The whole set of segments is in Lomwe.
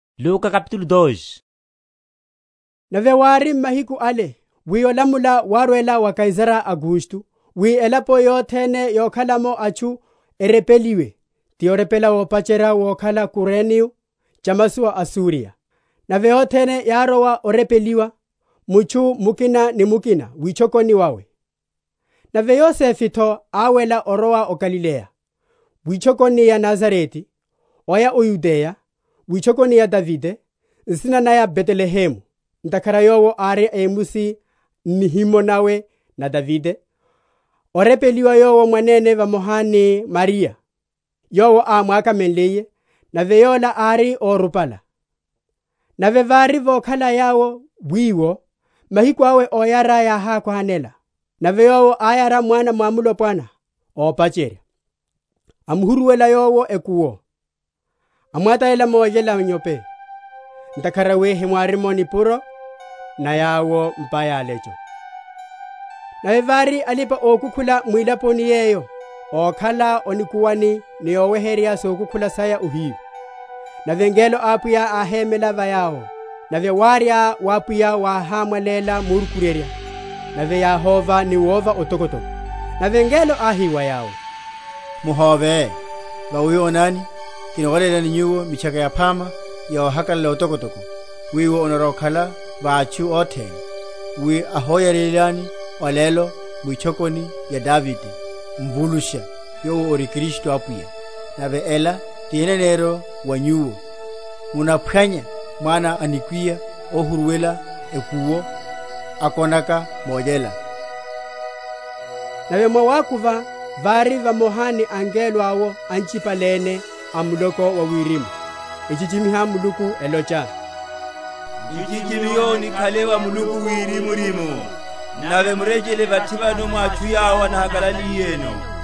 Oyariwa wawe wa Yesu Kristu. Nave wári m’mahiku ale, wi olamula wárwela wa Kaisara Augusto wi elapo yothene yokhala’mo atchu erepeliwe; ti orepela wopacherya vokhala Kureniyo chamasowa a Suriya. Nave othene yárowa orepeliwa, mutchu mukina ni mukina witchokoni wawe. Nave Yosefe’tho áwela orwela o Galileya, witchokoni ya Nazarete, oya o Yudeya, witchokoni ya Davide, nsina naya Betelehemu, ntakhara yowo ári a emusi n’nihimo nawe na Davide; orepeliwa yowo mwanene vamoha ni Mariya, yowo ámwakamenliye; nave yola ári órupala. Nave vári vokhala yawo wiwo, mahiku awe óyara yákhwanela. Nave yowo áyara mwana mwamulopwana ópacherya; amuhuruwela yowo ekuwo, amwatalela molyela inyope, ntakhara wi hewári nipuro na yawo m’pa ya alecho. Alipa‐okukhula a o Betelehemu. Nave vári alipa‐okukhula mwilaponi yeyo, ókhala o nikuwani ni oweherya sokukhula saya ohiyu. Nave ngelo a Apwiya áhémela va yawo, nave wárya wa Apwiya wáhámwaléla morukuryerya: nave yáhóva ni wova otokotoko. Nave ngelo áhi wa yawo, Muhóve; vawi onani, kinolélani nyuwo mitchaka yaphama ya ohakalala otokotoko, wiwo onarwa‐okhala wa atchu othene. Wi áhoyariwelani olelo, mwitchokoni ya Davide, Mvulusha, yowo ori Kristu Apwiya. Nave ela ti eneneryo wa nyuwo; Munaphwanya mwana a nikwiya ohuruwela ekuwo, akonaka molyela. Nave mwawakuva vári vamoha ni ngelo’wo anchipale’ne a muloko wa wirimu, echichimiha Muluku, elocha, Nchichimiho nikhale wa Muluku wirimurimu, Nave murechele vathi vano mwa atchu yawo anahakalaliyeno.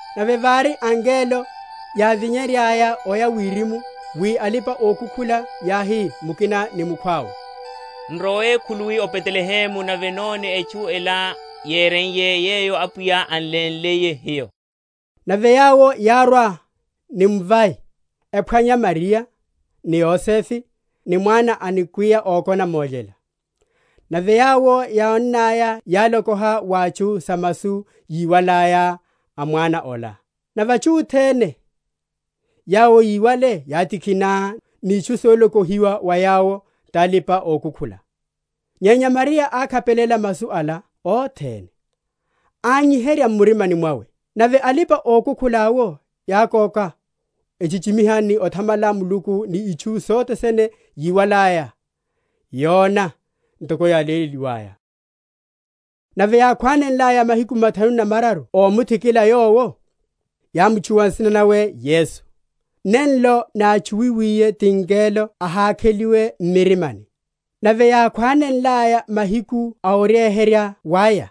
Nave vári, angelo yávinyenryaya oya wirimu, wi alipa‐okukhula yáhi mukina ni mukhwawe, N’rowele khuluwi o Betelehemu, nave none etchu ela yéreiye, yeyo Apwiya an’lénliye hiyo. Nave yawo yárwa ni mvai, ephwanya Mariya, ni Yosefe, ni mwana a nikwiya ókona molyela. Nave yawo, yónnaya, yálokoha wa atchu sa masu yíwalaya a mwana ola. Nave atchu othene yawo yíwale yátikhina ni itchu solokohiwa wa yawo talipa‐okukhula. Nyenya Mariya ákhapelela masu ala othene, ányiherya m’murimani mwawe. Nave alipa‐okukhula’wo yákoka, echichimiha ni othamala Muluku ni itchu sothe sene yíwalaya, yona, ntoko yáléleliwaya. Othikiliwa ni oveléliwa wawe wa Yesu. Nave yákhwanenlaya mahiku mathanu na mararu ómuthikila Yowo, yámutchuwa nsina nawe Yesu, nenlo nátchuwiwiye ti ngelo ahakheliwe m’mirimani. Nave yákhwanenlaya mahiku a oryeherya waya,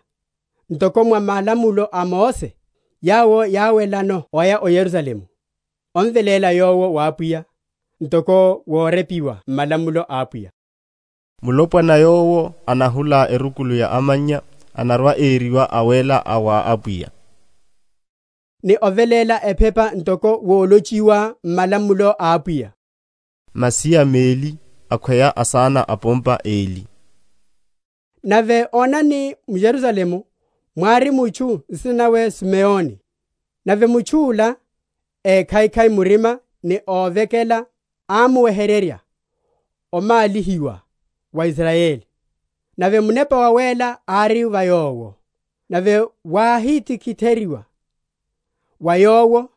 ntoko mwa malamulo a Mose, yawo yáwelano oya o Yerusalemu, omveléla Yowo wa Apwiya, (ntoko worepiwa m’malamulo a Apwiya, Mulopwana yowo anahula erukulu ya amannya anarwa‐eriwa awéla a wa Apwiya) ni oveléla ephepa ntoko wolochiwa m’malamulo a Apwiya, Masiya meli, akhweya asana a’pompa eli. Nave onani, m’Yerusalemu mwári mutchu, nsina nawe Sumeoni; nave mutchu’la, ékhaikhai murima ni óvekela, ámuweherya omálihiwa wa Israyeli; nave Munepa Wawéla ári va yowo. Nave wáhitiheryiwa wa yowo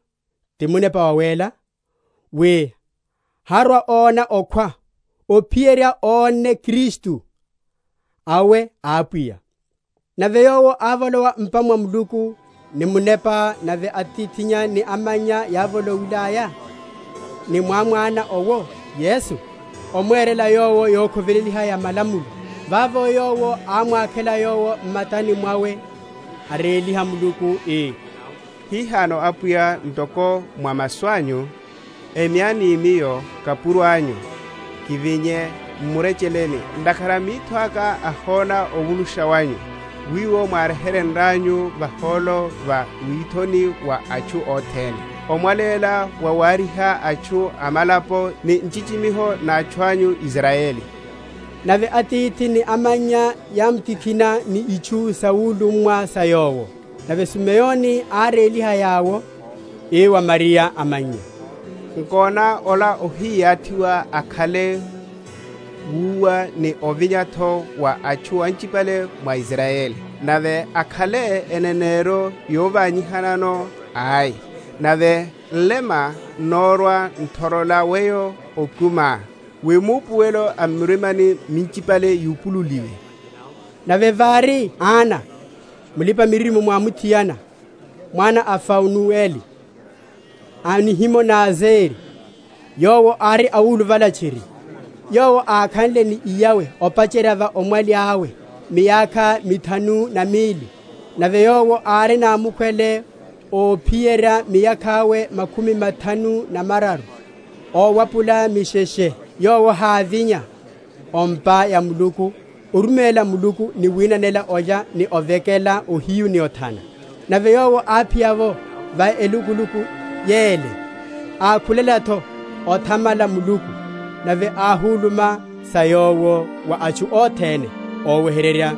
ti Munepa Wawéla, wi harwa‐ona okhwa, ophiyerya onne Kristu awe a Apwiya. Nave yowo ávolowa m’pa mwa Muluku, ni Munepa: nave atithi ni amannya yávolowilaya ni mwamwana owo Yesu, omwerela Yowo yokhoveleliwa ya malamulo, vavo yowo ámwakhela Yowo m’matani mwawe, aréliha Muluku, ii, Hihano, Apwiya, ntoko mwa masu anyu, Emyani miyo, kapuro anyu, kivinye m’murecheleni; Ntakhara mitho aka ahona ovulusha wanyu, Wiwo mwáryehenryanyu vahólo va withoni wa atchu othene, Omwaléla wawaryiha atchu a malapo, Ni nchichimiho na atchu anyu Israyeli. Nave atithi ni amannya yámtikhina ni itchu sawulummwa sa Yowo. Nave Sumeoni áréliha yawo, ii wa Mariya amannya, Nkona, ola ohiyathiwa akhale wúwa ni ovinya’tho wa atchu anchipale mwa Israyeli; Nave akhale eneneryo yovanyihanano; Ai, nave nlema n’narwa‐nothorola weyo okumiá; Wi maupuwelo a m’mirimani minchipale yupululiwe. Nave vári Ana, mulipa‐miririmo mwamuthiana, mwana a Fanueli, a nihimo na Azeri; yowo ári awuluvala tchiri, yowo ákhanle ni iyawe, opacherya va omwali awe, miyakha mithanu na mili, nave yowo ári namukhwele óphiyerya miyakha’we makhumi mathanu na mararu owapula misheshe, yowo hávinya o’mpa ya Muluku, oruméla Muluku ni winanela olya ni ovekela ohiyu ni othana. Nave yowo áphiya’wo va elukuluku yele, ákhulela’tho othamala Muluku, nave áhuluma sa Yowo wa atchu othene óweherya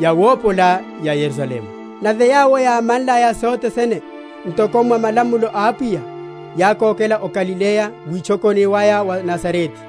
yawopola ya Yerusalemu. Nave yawo yámanlaya sothe sene ntoko mwa malamulo a Apwiya, yákokela o Galileya, witchokoni waya, o Nazarete.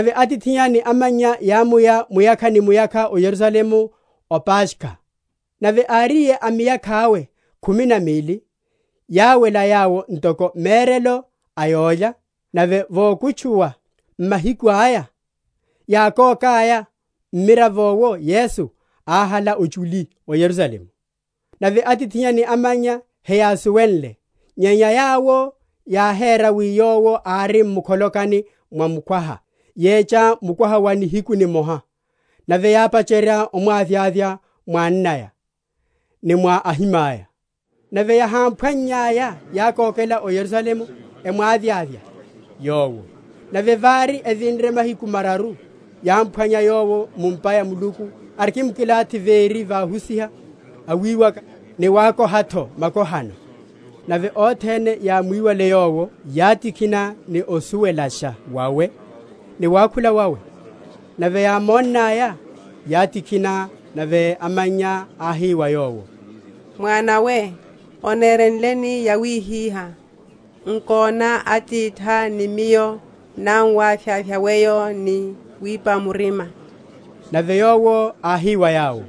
Nave atithinnya ni amannya yámuya muyakha ni muyakha o Yerusalemu o Paskha. Nave áriye a miyakha’we khumi na mili, yáwela yawo ntoko merelo a yólya; nave vokutchuwa mahiku aya, yákokaya, mmiravo’wo Yesu áhala ochuli o Yerusalemu. Nave atithinnya ni amannya heyásuwenle; nyenya yawo yáhera wi Yowo ári mu’kholokani mwa mukwaha, yecha mukwaha wa nihiku nimoha; nave yápacherya omwavyavya mwa annaya ni mwa ahimaya: nave yahámphwannyaya, yákokela o Yerusalemu, emwavyavya Yowo. Nave vári evinre mahiku mararu, yámphwanya Yowo mu’mpa ya Muluku, arikimkilathi véri va ahusiha, awiwaka, ni wakoha’tho makohano. Nave othene yámwiwale Yowo yátikhina ni osuwelasha wawe, ni wakhula wawe. Nave yámonnaya, yátikhina; nave amannya áhi wa Yowo, Mwana we, onerenleni yawihihá; nkona; atithá ni miyo námuwavyavya weyo ni wipa murima. Nave Yowo áhi wa yawo,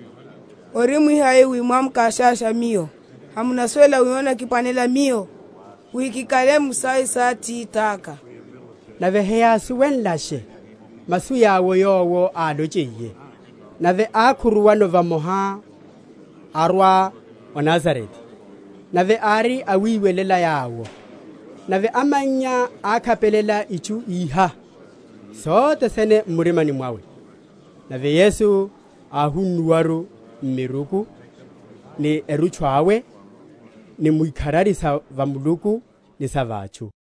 Orimwi hai wi mwámukavyavya Miyo? Hamunasuwela wi onnakiphwanela Miyo wi kikhale mu sawe sa Atithaka? Nave heyásuwenlesha masu yawo Yowo álonchiyeno. Nave ákhuruwano vamoha, arwa o Nazarete; nave ári awiwelela yawo: nave amannya ákhapelela itchu iha sothe sene m’murimani mwawe. Nave Yesu áhunnuwaru m’miruku ni erutchu awe, ni mu ikharari sa va Muluku ni sa va atchu.